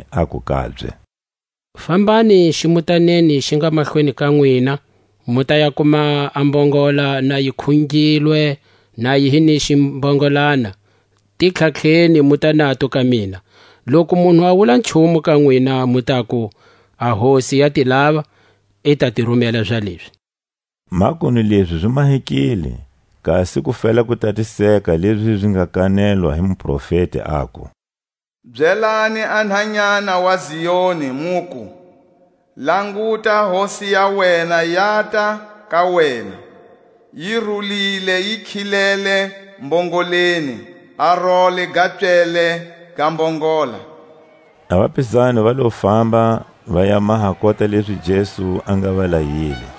aku kabye: Fambani zimutaneni xi nga mahlweni ka nwina, mu ta ya kuma a mbongola na yi khungilwe na yi hi ni ximbongolana; ti tlhatlheni muta nato ka mina. Loku munhu a wula nchumu ka nwina, mu taku: A Hosi ya ti lava; i ta ti rumela zalezi. Makunu lezi zi mahekile, kasi ku fela ku tatiseka lezi zi nga kanetwa hi muprofeti, aku: Byelani a nhanyana wa Zioni, muku: Languta, a Hosi ya wena yata ka wena, Yi rulile, yi khilele mbongoleni, A role ga pswele ga mbongola. A vapizani va lo famba, va ya maha kota lezi Jesu a nga va layile.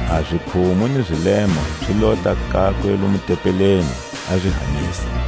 A zikhumu ni zilema zi lota kakwe lomu tempeleni, a zi hanyisa.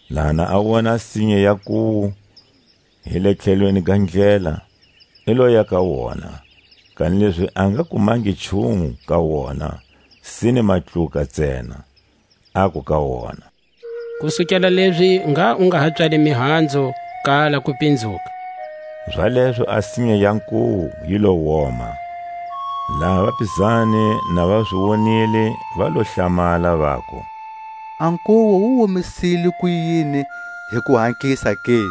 Laha ha a wona a sinya ya nkuwu hi le tlhelweni ga ndlela, i loya ka wona, kanilezi a nga kumangi nchumu ka wona, sine matluka ntsena. Aku ka wona: Kusukela lezi ngha u nga ha pswali mihanzu kala kupinzuka. Zalezo a sinya ya nkuwu yi lo woma. Laha vapizani na va zi wonile, va lo hlamala, vaku: A nkuwu wu omisile kuyini hi kuhatlisa ke?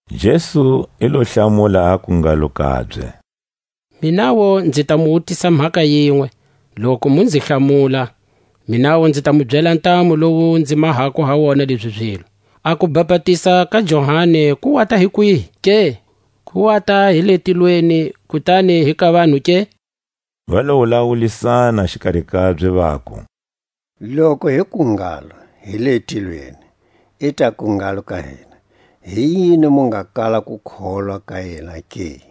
Jesu i lo hlamula, aku ngalo kabye: Minawu nzi ta mu wutisa mhaka yinwe, loku mu nzi hlamula, minawu nzi ta mu byela a ntamu lowu nzi mahako ha wona lezi zilo. A kubapatiza ka Johani, ku wata hi kwihi ke? Ku wata hi le tilweni, kutani hi ka vanhu ke? Va lo wulawulisana xikari kabye, vaku: Loku hi ku ngalo: Hi le tilweni, i taku ngalo ka hina: Hi yini mu nga kala ku kholwa ka yena ke?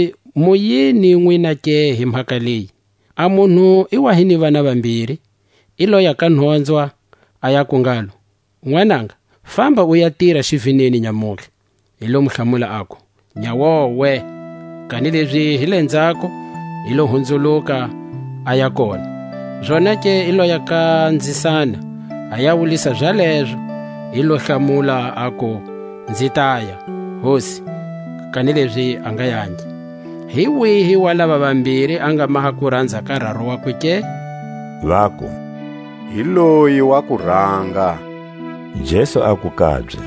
Kanilezi mu yini nwina ke hi mhaka leyi? A munhu i wa hi ni vana vambiri; i loya ka nhonzwa, a yaku ngalo: Nwananga, famba u ya tira xivineni nyamutlha. I lo hlamula, aku: Nyawowe; kanilezi hi lenzhako i lo hunzuluka, aya kona. Zonake i loya ka nzisana, a ya wulisa za lezo. I lo hlamula, aku: Nzi taya, hosi; kanilezi a nga yangi. Hi wihi wa lava vambiri a nga maha kuranza ka raru wakwe ke? Vaku: Hi loyi wa kuranga. Jesu aku kabye: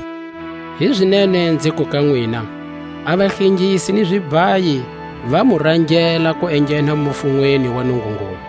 Hizinene nziku ka nwina: A vahlengisi ni zibhayi va mu rangela ku enghena mufunweni wa Nungungulu.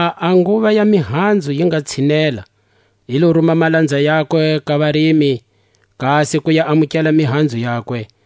Laha a nguva ya mihanzu yi nga tshinela, i lo ruma malanza yakwe ka varimi, kasi ku ya amukela mihanzu yakwe.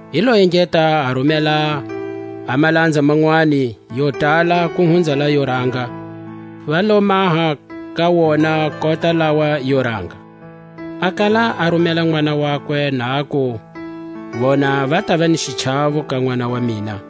I lo engeta a rumela a malanza manwani, yo tala ku hunza laʼyo ranga; va lo maha ka wona kota lawa yo ranga. A kala a rumela nʼwana wakwe, na aku: Vona va tava ni xichawo ka nʼwana wa mina.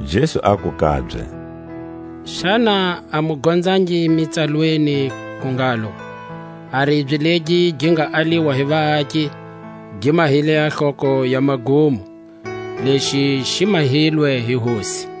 Jesu aku kabye: Xana a mu gonzangi Mitsalweni ku ngalo: A ribye legi gi nga aliwa hi vaaki, Gi mahile a hloko ya magumo; Lexi xi mahilwe hi Hosi,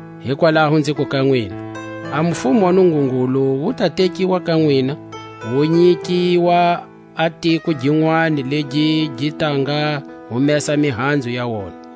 Hikwalaho nziku ka nwina: A mufumo wa Nungungulu wu ta tekiwa ka nwina, wu nyikiwa a tiko ginwani legi gi ta nga humesa a mihanzu ya wona.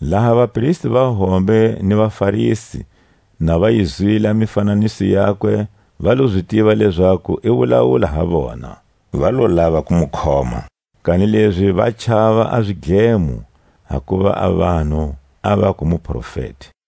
Laha a vapristi va hombe ni vaFarisi na va yi zwile a mifananiso yakwe, va lo zi tiva lezaku i wulawula ha vona; va lo lava ku mu khoma, kanilezi va chava a zidlemo, hakuva a vanhu a vaku muprofeti.